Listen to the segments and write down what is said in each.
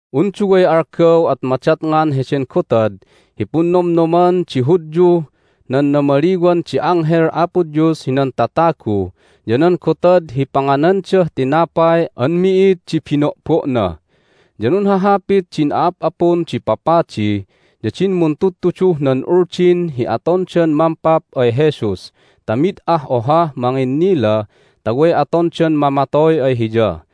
Un duway algaw at madatngan heden gotad hi Punnomnoman di Hudyuh nan Namaliwan di Anghel Apo Dios hinan Tatagu ya nan gotad hi Panganandah Tinapay an Mi'id di Bino'bo'na. Ya nunhahapit din a'ap'apun di papadi ya din muntudtuduh nan Uldin hi atondan mampap ay Jesus ta mid ah ohah manginnila ta way atondan mamatoy ay Hiya.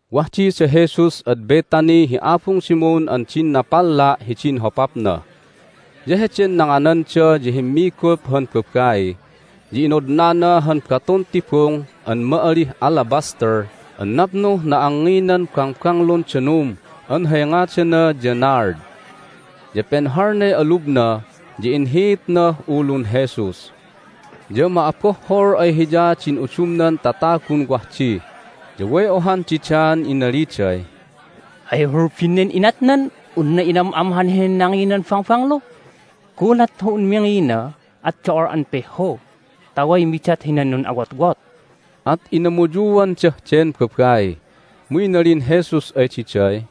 Wah di da Jesus ad Bethany hi abung Simon an din napalla' hidin hopapna. Ya heden nangananda ya himmigup han babai, ya inodnana han batun tibung an ma'alih alabaster an napnuh na'angnginan bangbanglun danum an hay ngadana ya nard. Ya penhalnay alubna, ya inhiitnah ulun Jesus. Ya ma'abohhol ay hiya din udumnan tatagun wah di, ya way ohan didaan inaliday, "Hay hulbin nen inatnan unna inam'amhan henen nanginan bangbanglu? Gulat hi un mingina at do'ol an pihhu ta way midat hinan nun'awotwot!" At inamuyuandah den babai. Mu inalin Jesus ay diday,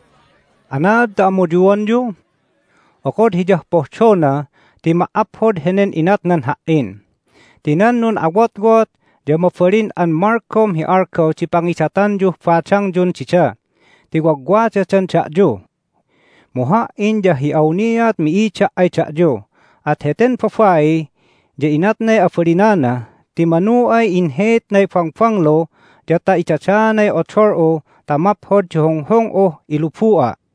"Anaad ta amuyuanyu? Okod hiyah pohdona ti ma"aphod henen inatnan Ha"in! Ti nan nun'awotwot ya mabalin an malgom hi algaw di pangidatanyuh badangyun dida ti wagwadadan da'yu. Mu Ha"in ya hi awniat mi'ida' ay da'yu. At heten babai ya inatnay abalinana, ti manu ay inhiitnay bangbanglu ya ta idadaanay odol'u ta maphod di hunghung'uh ilubu'a'.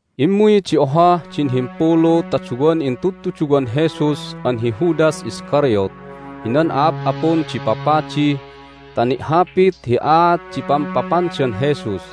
Immuy di ohah din himpulu ta duwan intudtuduwan Jesus an hi Judas Iscariot hinan a'ap'apun di papadi ta ni'hapit hi aat di pampapandan Jesus.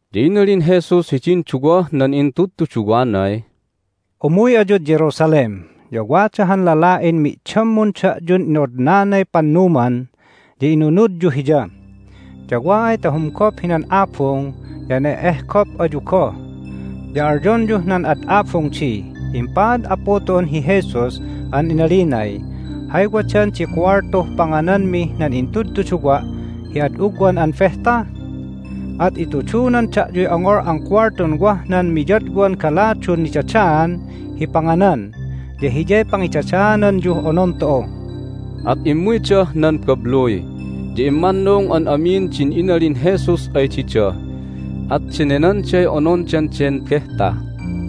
Ya inalin Jesus hidin duwah nan intudtuduwanay, "Umuy ayud Jerusalem, ya wada han lala'in mi'dammun da'yun ino'odnanay pannuman, ya inunudyu hiya. Ya wa ay ta humgop hinan abung ya ne'ehgop ayu goh. Ya alyonyuh nan ad abung di, Impaad Apu tu'un hi Jesus an inalinay, Hay wadan di kuwaltuh pangananmih nan intudtuduwa' hi ad ugwan an behta? At itudunan da'yuy ongol an kuwaltun wah nan miyadwan galadun nidadaan hi panganan, ya hiyay pangidadaananyuh onon tu'u." At immuydah nan babluy, ya immannung an amin din inalin Jesus ay dida. At denenanday onondan den behta.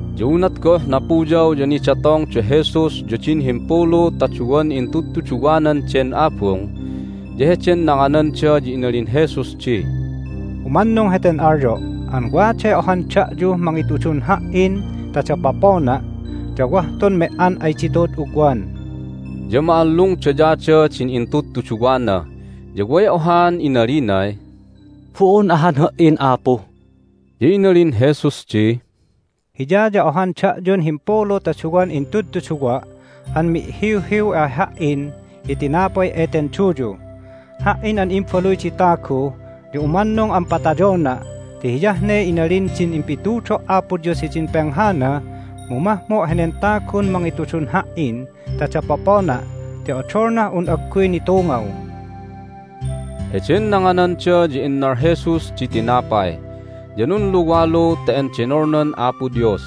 Ya unat goh napuyaw ya nidatong da Jesus ya din himpulu ta duwan intudtuduwanan den abung. Ya heden nangananda ya inalin Jesus di, "Umannung heten alyo' an waday ohan da'yuh mangitudun Ha"in ta dapopona', ya wah tun me"an ay ditu'ud ugwan." Ya ma'allungdayada din intudtuduwana, ya way ohaan inalinay, "Bo'on ahan ha"in Apu!" Ya inalin Jesus di, "Hiya ya ohan da'yun himpulu ta duwan intudtuduwa' an mi'hiwhiw ay Ha"in hi tinapay eten duyu. Ha"in an Imbaluy di Tagu ya umannung an patayona' ti hiyah ne inalin din impitudo' Apo Dios hidin penghana, mu mahmo' henen tagun mangitudun Ha"in ta dapopona' ti odolnah un agguy nitungaw!" Heden nangananda ya innal Jesus di tinapay, ya nunluwalu ta endenolnan Apo Dios,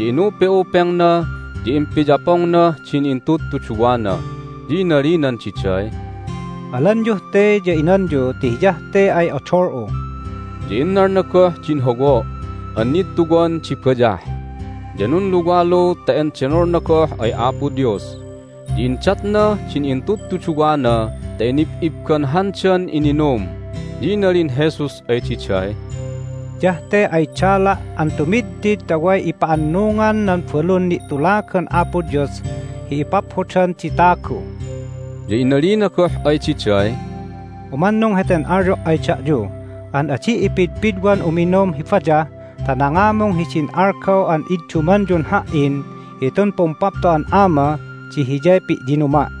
ya inupe'upengna, ya impiyapongnah din intudtuduwana. Ya inalinan diday, "Alanyuh te, ya inanyu ti hiyah te ay odol'u." Ya innalna goh din howo' an nittuwan di bayah, ya nunluwalu ta endenolna goh ay Apo Dios, ya indatnah din intudtuduwana ta inib'ibbanhandan ininum. Ya inalin Jesus ay diday, "Hiyah te ay dala' an tumidtid ta way ipa'annungan nan balun ni'tulagan Apo Dios hi ipaphodan di tagu." Ya inalina goh ay diday, "Ummannung heten alyo' ay da'yu an adi' ipidpidwan uminum hi bayah ta nangamung hidin algaw an iddumanyun Ha"in hitun Pumpapto'an Ama di hiyay pi'yinuma'."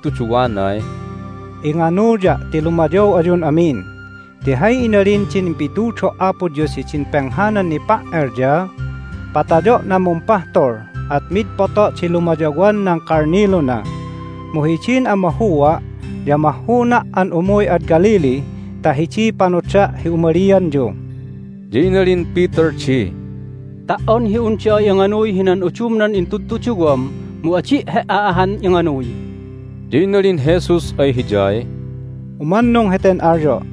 Inalin Jesus hidin intudtuduwanay, "Inganuya' ti lumayaw ayun amin. Ti hay inalin din impitudo' Apo Dios hidin penghanan nipa"el ya: Patayo' nan mumpahtul, at mid poto' di lumayawan nan kalniluna. Mu hidin amahua' ya mahhuna' an umuy ad Galilee ta hidiy panoda' hi umalianyu." Ya inalin Peter di, "Ta"on hi un da'a inganuy hinan udumnan intudtuduwam mu adi' He"a ahan inganuy!" Ya inalin Jesus ay hiyay, "Umannung heten alyo'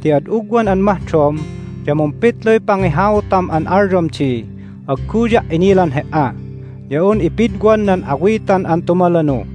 ti ad ugwan an mahdom ya mumpitluy pangihautam an alyom di, Agguya' inilan He"a! ya un ipidwan nan awitan an tumalanu."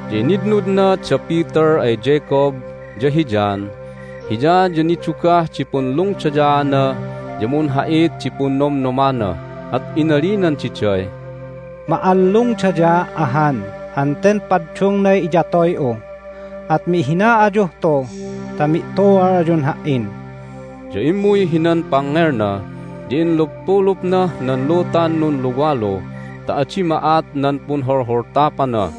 Ya initnudna da Peter ay Jacob, ya hi John. Hiya ya nidugah di punlungdayaana, ya munha'it di punnomnomana, at inalinan diday, "Ma'allungdayaa' ahan an ten paddungnay iyatoy'u! At mihina ayuh tu ta mi'tu'al ayun Ha"in." Ya immuy hinan pangngelna, ya inluppulupnah nan lutan nunluwalu ta adi ma'at nan punholholtapana.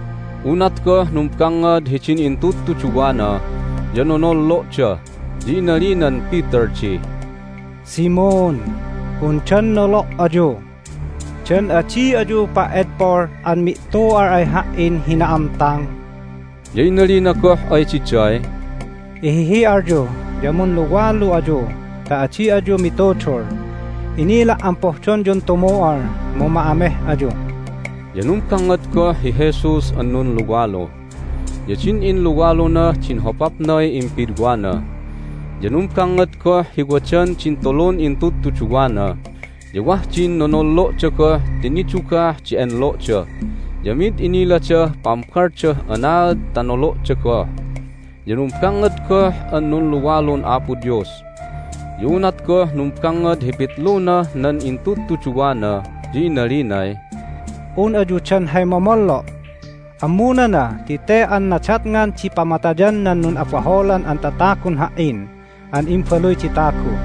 Unat goh numbangngad hidin intudtuduwana ya nonollo'da. Ya inalinan Peter di, "Simon, undan nolo' ayu? Dan adi ayu pa"edpol an mi'tu'al ay Ha"in hi na'amtang?" Ya inalina goh ay diday, "Ihihi'alyu ya munluwalu ayu ta adi ayu mitudul! Inila' an pohdonyun tumu'al, mu ma'ameh ayu." Ya numbangngad goh hi Jesus an nunluwalu, ya din inluwalunah din hopapnay impidwana. Ya numbangngad goh hi wadan din tulun intudtuduwana, ya wah din nonollo'da goh ti nidugah di enlo'da. Ya mid iniladah pambaldah anaad ta nolo'da goh. Ya numbangngad goh an nunluwalun Apo Dios. Ya unat goh numbangngad hi pitlunah nan intudtuduwana ya inalinay, "Un ayu dan hay momollo'? Ammunana ti te an nadatngan di pamatayan nan nun'abaholan an tatagun Ha"in an Imbaluy di Tagu.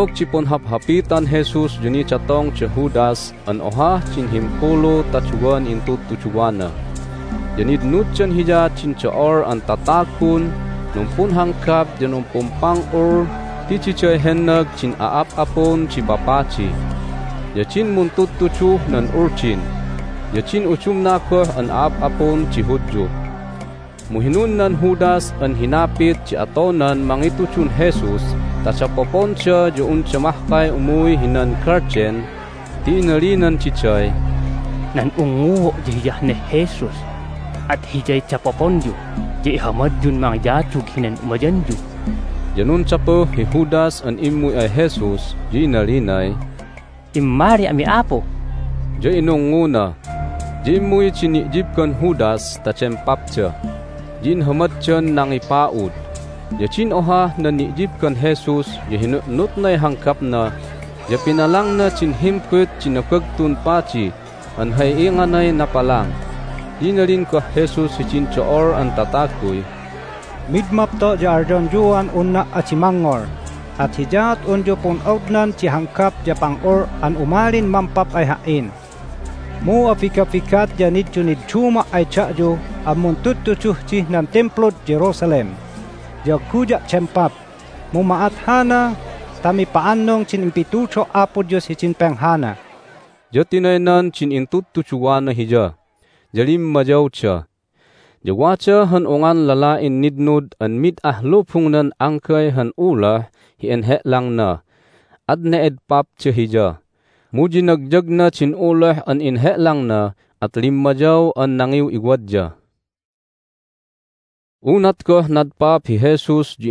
Otog di punhaphapitan Jesus ya nidatong da Judas an ohah din himpulu ta duwan intudtuduwana. Ya nitnuddan hiya din do'ol an tatagun numpunhanggap ya numpumpang'ul ti diday hennag din a'ap'apun di papadi, ya din muntudtuduh nan Uldin, ya din udumna goh an a'ap'apun di Hudyu. Mu hinunnan Judas an hinapit di atonan mangitudun Jesus ta dapoponda ya unda mahkay umuy hinan galden ti inalinan diday, "Nan ungnguo' ya Hiyah neh Jesus. At Hiyay dapoponyu, ya ihamadyun mangiyadug hinan umayanyu." Ya nundapuh hi Judas an immuy ay Jesus, ya inalinay, "Immali ami, Apu!" Ya inungnguna. Ya immuy din ni'yibban Judas ta dempapda, ya inhamaddan nangipa'ud. Ya din ohah nan ni'yibban Jesus ya hinu'nutnay hanggapna, ya pinalangna din himbut di Nabagtun Padi an hay inganay napalang. Ya inalin goh Jesus hidin do'ol an tataguy, "Mid mapto' ya alyonyuan unna' adi mangngol, at hiyaat unyu pun'ognan di hanggap ya pang'ul an umalin mampap ay Ha"in! Mu abigabigat ya niddunidduma' ay da'yu an muntudtuduh dih nan Timplud Jerusalem, ya agguya' dempap. Mu ma'at hana ta mipa'annung din impitudo' Apo Dios hidin penghana." Ya tinaynan din intudtuduwana Hiya, ya limmayawda. Ya wada han ungan lala'in nitnud an mid ah lubungnan anggay han uloh hi inhe'langna. At ne'edpapda hiya, mu yinagyagna din uloh an enhe'langna, at limmayaw an nangiw'iwadya. Hay Nanumalyaan nan A'ap'apun di Hudyun Jesus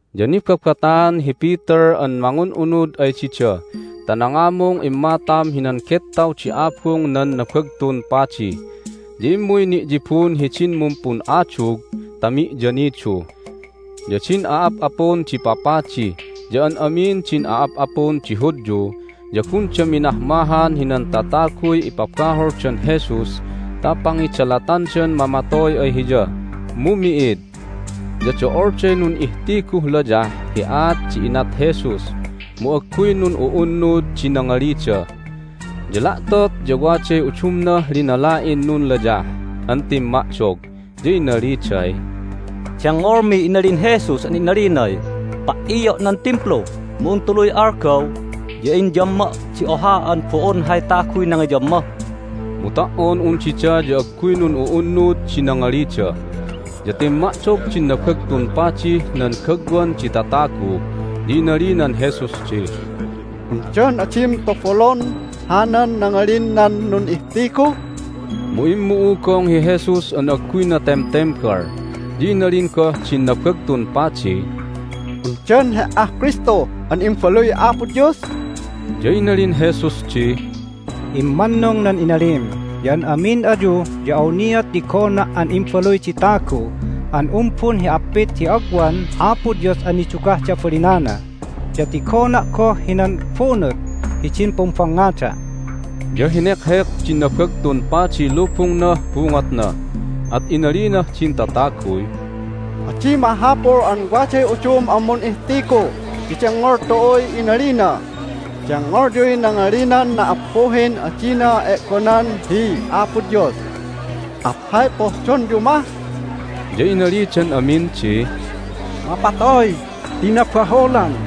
Ya nibabataan hi Peter an mangun'unud ay dida ta nangamung immatam hinan gettaw di abung nan Nabagtun Padi. Ya immuy ni'yibun hidin mumpun'adug ta mi'yanidu. Ya din a'ap'apun di papadi ya an amin din a'ap'apun di Hudyu ya gunda minahmahan hinan tataguy ipabaholdan Jesus ta pangidalatandan mamatoy ay Hiya, mu mi'id. Ya do'olday nun'ihtiguh layah hi aat di inat Jesus, mu agguy nun'u'unnud di nangalida. Ya la'tot ya waday udumnah linala'in nunlayah an timma'dog, ya inaliday, "Dengngolmiy inalin Jesus an inalinay, Pa"io' nan Timplu, mu un tuluy algaw ya inyamma' di oha an bo'on hay taguy nangiyamma." Mu ta"on un dida ya agguy nun'u'unnud di nangalida. Ya timma'dog din Nabagtun Padih nan gagwan di tatagu, ya inalinan Jesus di, "Undan adim tobolon hanan nangalin nan nun'ihtigu?" Mu immu'ugong hi Jesus an agguyna temtembal. Ya inalin goh din Nabagtun Padiy, "Undan He"ah Kristu an Imbaluy Apo Dios?" Ya inalin Jesus di, "Immannung nan inalim, ya an amin ayu ya awniat tigona' an Imbaluy di Tagu an umbun hi appit di agwan Apo Dios an nidugah di abalinana. Ya tigona' goh hinan bunut hidin pumbangngada'." Ya henekhek din Nabagtun Padiy lubungnah bungotna, at inalinah din tataguy, "Adi mahapul an waday udum an mun'ihtigu ti dengngol tu'uy inalina! Dengngolyuy nangalinan na"appuhin adina e'gonan hi Apo Dios! At hay pohdonyu mah?" Ya inalidan amin di, "Mapatoy ti nabaholan!"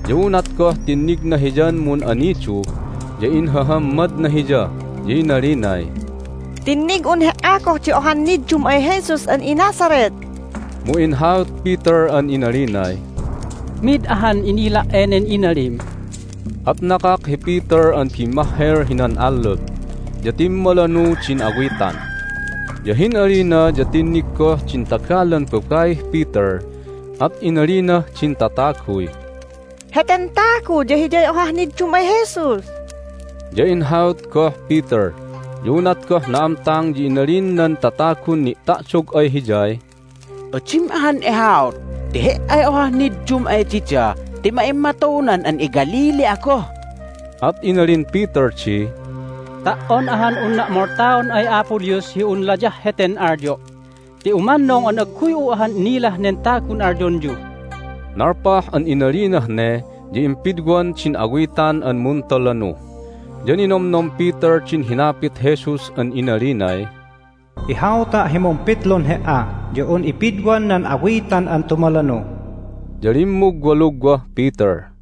ya unat goh tinnigna hiyan mun'anidu ya inhahammadna hiya, ya inalinay, "Tinnig'un he"a goh di ohan niddum ay Jesus an iNazareth!" Mu inhaut Peter an inalinay, "Mid ahan inila' enen inalim!" At nakak hi Peter an bimmahhel hinan allup, ya timmalanu din awitan. Ya hin'alina ya tinnig goh din tagalan babaih Peter, at inalinah din tataguy, "Heten tagu ya hiyay ohah niddum ay Jesus!" Ya inhaut goh Peter. Ya unat goh na'amtang ya inalin nan tatagun ni'ta'dog ay hiyay, "Adim ahan ihaut ti he"ay ohah niddum ay dida ti ma'immatunan an iGalilee'a goh!" At inalin Peter di, "Ta"on ahan unna' moltaon ay Apo Dios hi un layah heten alyo' ti umannung an agguy'u ahan inilah nen tagun alyonyu!" Nalpah an inalinah ne ya impidwan din awitan an muntalanu. Ya ninomnom Peter din hinapit Jesus an inalinay, "Ihauta' hi mumpitlun he"a ya un ipidwan nan awitan an tumalanu." Ya limmugwalugwah Peter.